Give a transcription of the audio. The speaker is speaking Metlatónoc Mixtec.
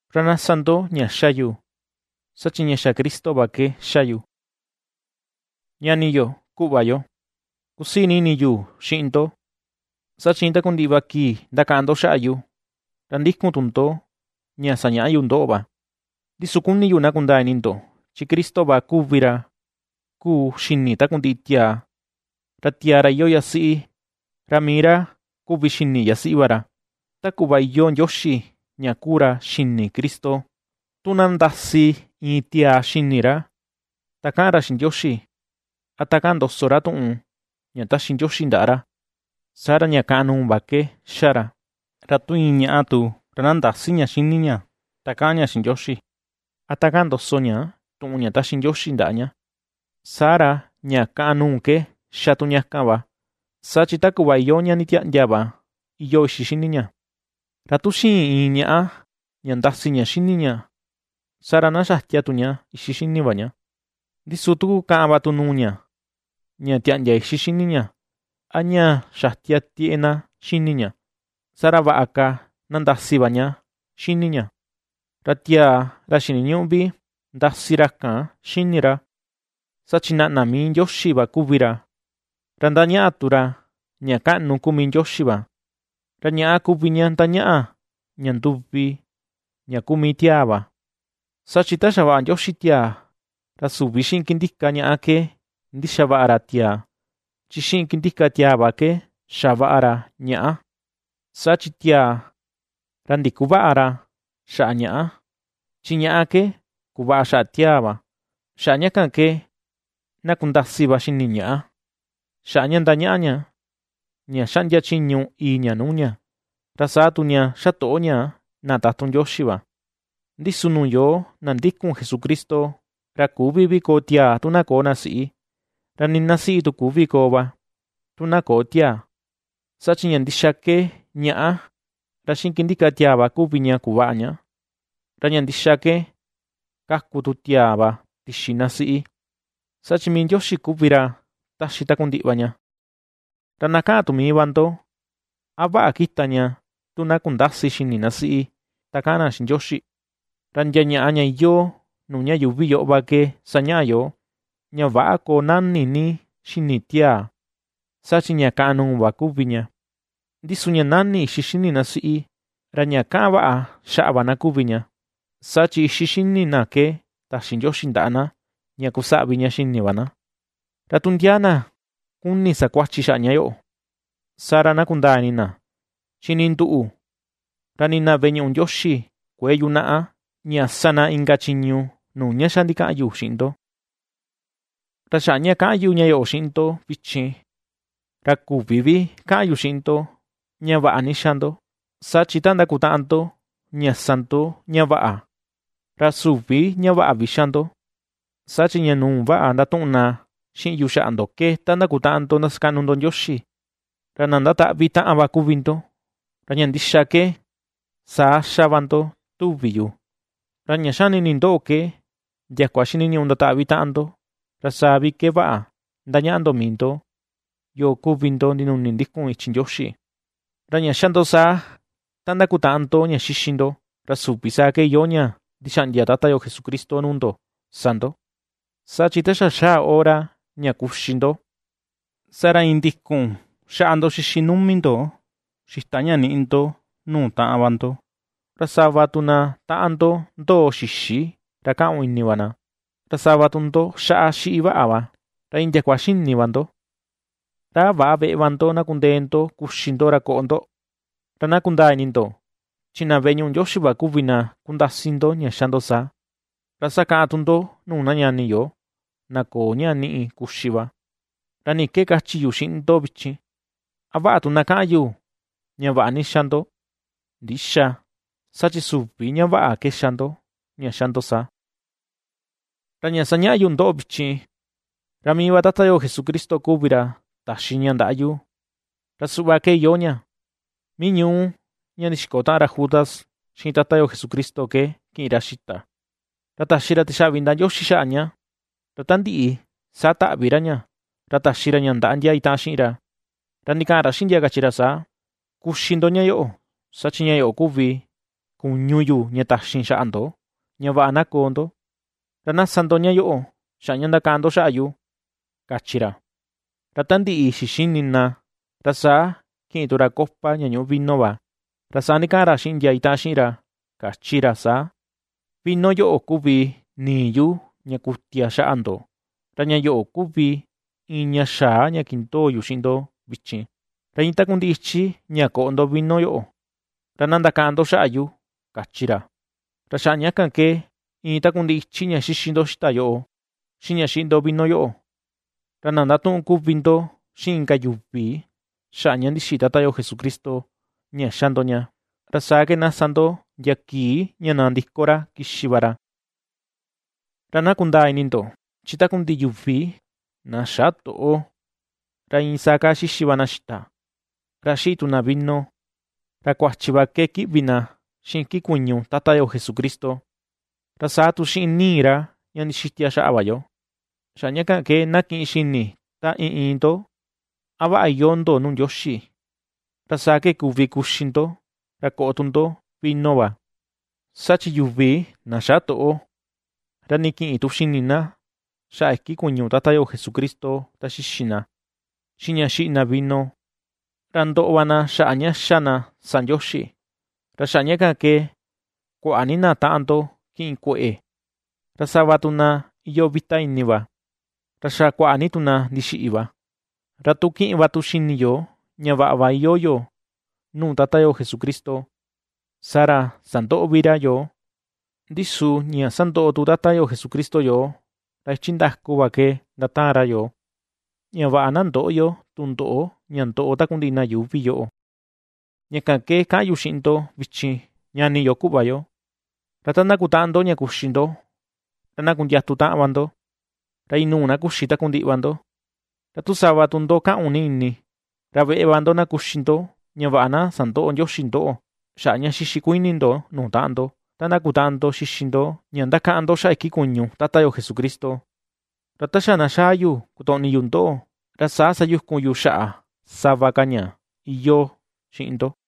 Ra na sa ndo ña ^xa yu, saa chi ña xa Cristo va ke ^xa yu. Ñani yo, kuꞌva yo, kusii ni ini yu xiꞌin ndo, saa chi iin takundiꞌi va kii ndakaꞌan ndo xaꞌa yu, ra ndikun tu ndo ña sañaꞌa yu ndoꞌo va. Ndi su kuni yu na kundaa ini ndo, chi Cristo va kuvi ra kuu xini takundiꞌi tiaa, ra tiaa ra iyoo yasiꞌi, ra mii ra kuvi xini yasiꞌi va ra, ta kuꞌva iyoo Ndioxi ña kuu ra xini Cristo. Tu na ndasi iin tiaa xini ra, ta kaꞌan ra xiꞌin Ndioxi, a ta kaꞌan ndoso ra tuꞌun ña ^taxi Ndioxi ndaꞌa ra, saa ra ña ka̱ꞌa̱n nuu va ke ^xa ra. Ra tu iin ñaꞌa tu, ra na ndäsi ña xini ña ta kaꞌan ña xiꞌin Ndioxi, a ta kaꞌan ndoso ña tuꞌun ña ^taxi Ndioxi ndaꞌa ña, saa ra ña ka̱ꞌa̱n nuu ke xa tu ña kan va; saa chi ta kuꞌva iyoo ña nditiaꞌndia va iyoo ixi xini ña. Ra tu xïin iin ñaꞌa ña ndasi ña xini ña, saa ra na xatia tu ña ixi xini va ña. Ndi su tu kukaꞌan va tu nuu ña, ña tiaꞌndia ixi xini ña, a ña xatia tieꞌe na xini ña, saa ra vaꞌa ka na ndasi va ña xini ña. Ra tiaa, ra xiniñüꞌu vi ndasi ra kan xini ra, saa chi naꞌna mii Ndioxi va kuvi ra, ra ndañaꞌa tu ra ña kaꞌnu kuu mii Ndioxi va. Ra ñaꞌá kuvi ña ^ndañaꞌa, ña nduvi ña kuu mii tiaa va; Saa chi ta xavaꞌa Ndioxi tiaa, ra süvi xiꞌin kindika ñaꞌa ke ndixavaꞌa ra tiaa, chi xiꞌin kindika tiaa va ke xavaꞌa ra ñaꞌá. Saa chi tiaa, ra ndikuväꞌa ra xaꞌa ñaꞌá, chi ñaꞌá ke kuvaꞌa xaꞌa tiaa va. Xaꞌa ña kan ke, na kundasi va xini ñaꞌá, xaꞌa ña ^ndañaꞌa ña, ña xaꞌndia chiñu ìi̱ ña nuu ña, ra saa tu ña xatoꞌo ña na tatun Ndioxi va. Ndi su nuu yoo na ndikun Jesucristo, ra küvi vi koo tiaa tu na köo na siꞌi, ra nii na siꞌi tu küvi koo va tu na köo tiaa. Saa chi ña ndixa ke ñaꞌá ra xiꞌin kindika tiaa va kuvi ña kuvaꞌa ña, ra ña ndixa ke ^kaku tu tiaa va tixi na siꞌi; saa chi mii Ndioxi kuvi ra ^taxi takundiꞌi va ña. Ra na ^kaꞌan tu mii va ndo, ¿a vaꞌa kita ña tu na kundäsi xini na siꞌi, ta kaꞌan na xiꞌin Ndioxi? Ra ndia ñaꞌa ña iyoo nuu ña yuuvi yoꞌo va ke sañaꞌa yoo, ña väꞌa koo nani ni xini tiaa, saa chi ña ka̱ꞌa̱n nuu va kuvi ña. Ndi su ña nani ixi xini na siꞌi, ra ña kaꞌan vaꞌa xaꞌa va na kuvi ña; saa chi ixi xini na ke taxi Ndioxi ndaꞌa na ña kusaꞌvi ña xini va na. Ra tu ndia na kuni sa kuachi xaꞌa ña yoꞌo, saa ra na kundaa ini na, chi nii nduꞌu, ra nii na veꞌe ñuꞌu Ndioxi kuëe yunaꞌa ña sa na inka chiñu nuu ña xa ndikaꞌan yu xiꞌin ndo. Ra xaꞌa ña ^kaꞌan yu ña yoꞌo xiꞌin ndo vichin, ra küvi vi kaꞌan yu xiꞌin ndo ña vaꞌa ni ^xa ndo, saa chi ta ndakutaꞌan ndo, ña sa ndo ña vaꞌa, ra süvi ña vaꞌa vi ^xa ndo. Saa chi, ña nuu vaꞌa ^ndatuꞌun na xiꞌin yu xaꞌa ndo ke ta ndakutaꞌan ndo ndasakaꞌnu ndo Ndioxi, ra na ndataꞌvi taꞌan va kuvi ndo; ra ña ndixa ke, saa ^xa va ndo tuvi yu. Ra ña xani ini ndoꞌo ke ¡ndiakua xiniñuꞌu ndataꞌvi taꞌan ndo, ra saa vi ke vaꞌa ndañaꞌa ndo mii ndo, yoo kuvi ndo ndinuni ndikun ichi Ndioxi! Ra ña xá ndo saa, ta ndakutaꞌan ndo ña xixi ndo. Ra süvi saa ke iyoo ña ndixaꞌndia Tata yo Jesucristo nuu ndo sa ndo. Saa chi ta xa̱ xáá hora ña kuxi ndo, saa ra iin ndikun xáꞌá ndo xíxi numi ndo xita ña ^niꞌi ndo nuu taꞌan va ndo; ra sava tu na taꞌan ndo ndoo xïxi ra kaꞌun ini va na, ra sava tu ndo ^xaꞌa xiꞌi vaꞌa va, ra iin ndiakua xini va ndo. ¿Ra a väꞌa veꞌe va ndo na kundee ndo kuxi ndo, ra koꞌo ndo? Ra na kundaa ini ndo, chi na veꞌe ñuꞌu Ndioxi va kuvi na kundasi ndo ña ^xa ndo saa, ra sakaꞌan tu ndo nuu na ñani yo, na köo ña niꞌi kuxi va. ¿Ra ni ke kachi yu xiꞌin ndo vichin? ¿A vaꞌa tu na kaꞌan yu ña vaꞌa ni ^xa ndo? Ndïxa, ¡saa chi süvi ña vaꞌa ke ^xa ndo, ña ^xa ndo saa! Ra ña ^sañaꞌa yu ndoꞌo vichin, ra mii va Tata yo Jesucristo kuvi ra taxi ña ndaꞌa yu, ra suꞌva ke iyoo ña: Mii ñuú ña ndixiko taꞌan ra Judas xiꞌin Tata yo Jesucristo ke kiꞌin ra xita, ra taxi ra tixaꞌvi ndaꞌa Ndioxi xaꞌa ña, ra ta ndiꞌi, saa taꞌvi ra ña, ra taxi ra ña ndaꞌa ndia itaꞌan xiꞌin ra, ra ndikaꞌan ra xiꞌin ndia, kachi ra saa: “Kuxi ndo ña yoꞌo, saa chi ña yoꞌo kuvi kuñu yu ña taxin xaꞌa ndo ña vaꞌa na koo ndo. Ra na sa ndo ña yoꞌo xaꞌa ña ^ndakaꞌan ndo xaꞌa yu”, kachi ra. Ra ta ndiꞌi xixini na, ra saa kiꞌin tu ra copa ña ñuꞌu vino va, ra saa ndikaꞌan ra xiꞌin ndia itaꞌan xiꞌin ra, kachi ra saa: “Vino yoꞌo, kuvi nii yu ña kutia xaꞌa ndo, ra ña yoꞌo kuvi iin ña xaa ña kindoo yu xiꞌin ndo vichin, ra iin takundiꞌi ichi ña koꞌo ndo vino yoꞌo, ra na ndakaꞌan ndo xaꞌa yu”, kachi ra. Ra xaꞌa ña kan ke, iin takundiꞌi ichi ña xixi ndo xita yoꞌo, xiꞌin ña xiꞌi ndo vino yoꞌo, ra na ndatuꞌun kuvi ndo xiꞌin inka yuvi xaꞌa ña ndixiꞌi Tata yo Jesucristo ña ^xa ndo ña. Ra saa ke na sa ndo ndia kii ña nandiko ra kixi va ra. Ra na kundaa ini ndo, chi takundiꞌi yuvi na xätoꞌo, ra iin saa kaa xixi va na xita, ra xiꞌi tu na vino, ra kuachi va ke kiꞌvi na xiꞌin iki kuñu Tata yo Jesucristo, ra saa tu xiꞌin nii ra ña ndixitia xaꞌa va yo. Xaꞌa ña kan ke, na kiꞌin xini ta iin iin ndo a vaꞌa iyoo ndo nuu Ndioxi, ra saa ke kuvi kuxi ndo, ra koꞌo tu ndo vino va. Saa chi yuvi na xätoꞌo, ra nii kïꞌin tu xini na xaꞌa iki kuñu Tata yo Jesucristo ta xixi na, xiꞌin ña xiꞌi na vino, ra ndoꞌo va na xaꞌa ña ^xa na sa Ndioxi. Ra xaꞌa ña kan ke kuaꞌa ni na taꞌan ndo kiꞌin kueꞌe, ra sava tu na iyoo vita ini va, ra xa kuaꞌa ni tu na ndixiꞌi va. Ra tu kiꞌin va tu xini yo, ña vaꞌa va iyoo yo nuu Tata yo Jesucristo, saa ra sandöꞌo vi ra yoo. Ndi su ña ^sandoꞌo tu Tata yo Jesucristo yoo, ra ichi ndaku va ke ndataan ra yoo, ña vaꞌa na ndöꞌo yo tundoꞌo ña ndoꞌo takundiꞌi na yuuvi yoꞌo. Ña kan ke kaꞌan yu xiꞌin ndo vichin, ñani yo, kuꞌva yo, ra ta ndakutaꞌan ndo ña kuxi ndo, ra na kundiatu taꞌan va ndo, ra inuu na kuxi takundiꞌi va ndo. Ra tu sava tu ndo kaꞌun ni ini, ra veꞌe va ndo na kuxi ndo, ña vaꞌa na sandöꞌo Ndioxi ndoꞌo, xaꞌa ña xixi kuini ndo nuu taꞌan ndo, ta ndakutaꞌan ndo xixi ndo ña ndakaꞌan ndo xaꞌa iki kuñu Tata yo Jesucristo. Ra ta xa na xaa yu kotoꞌni yu ndoꞌo, ra saa sayukun yu xaꞌa sava ka ña iyoo xiꞌin ndo.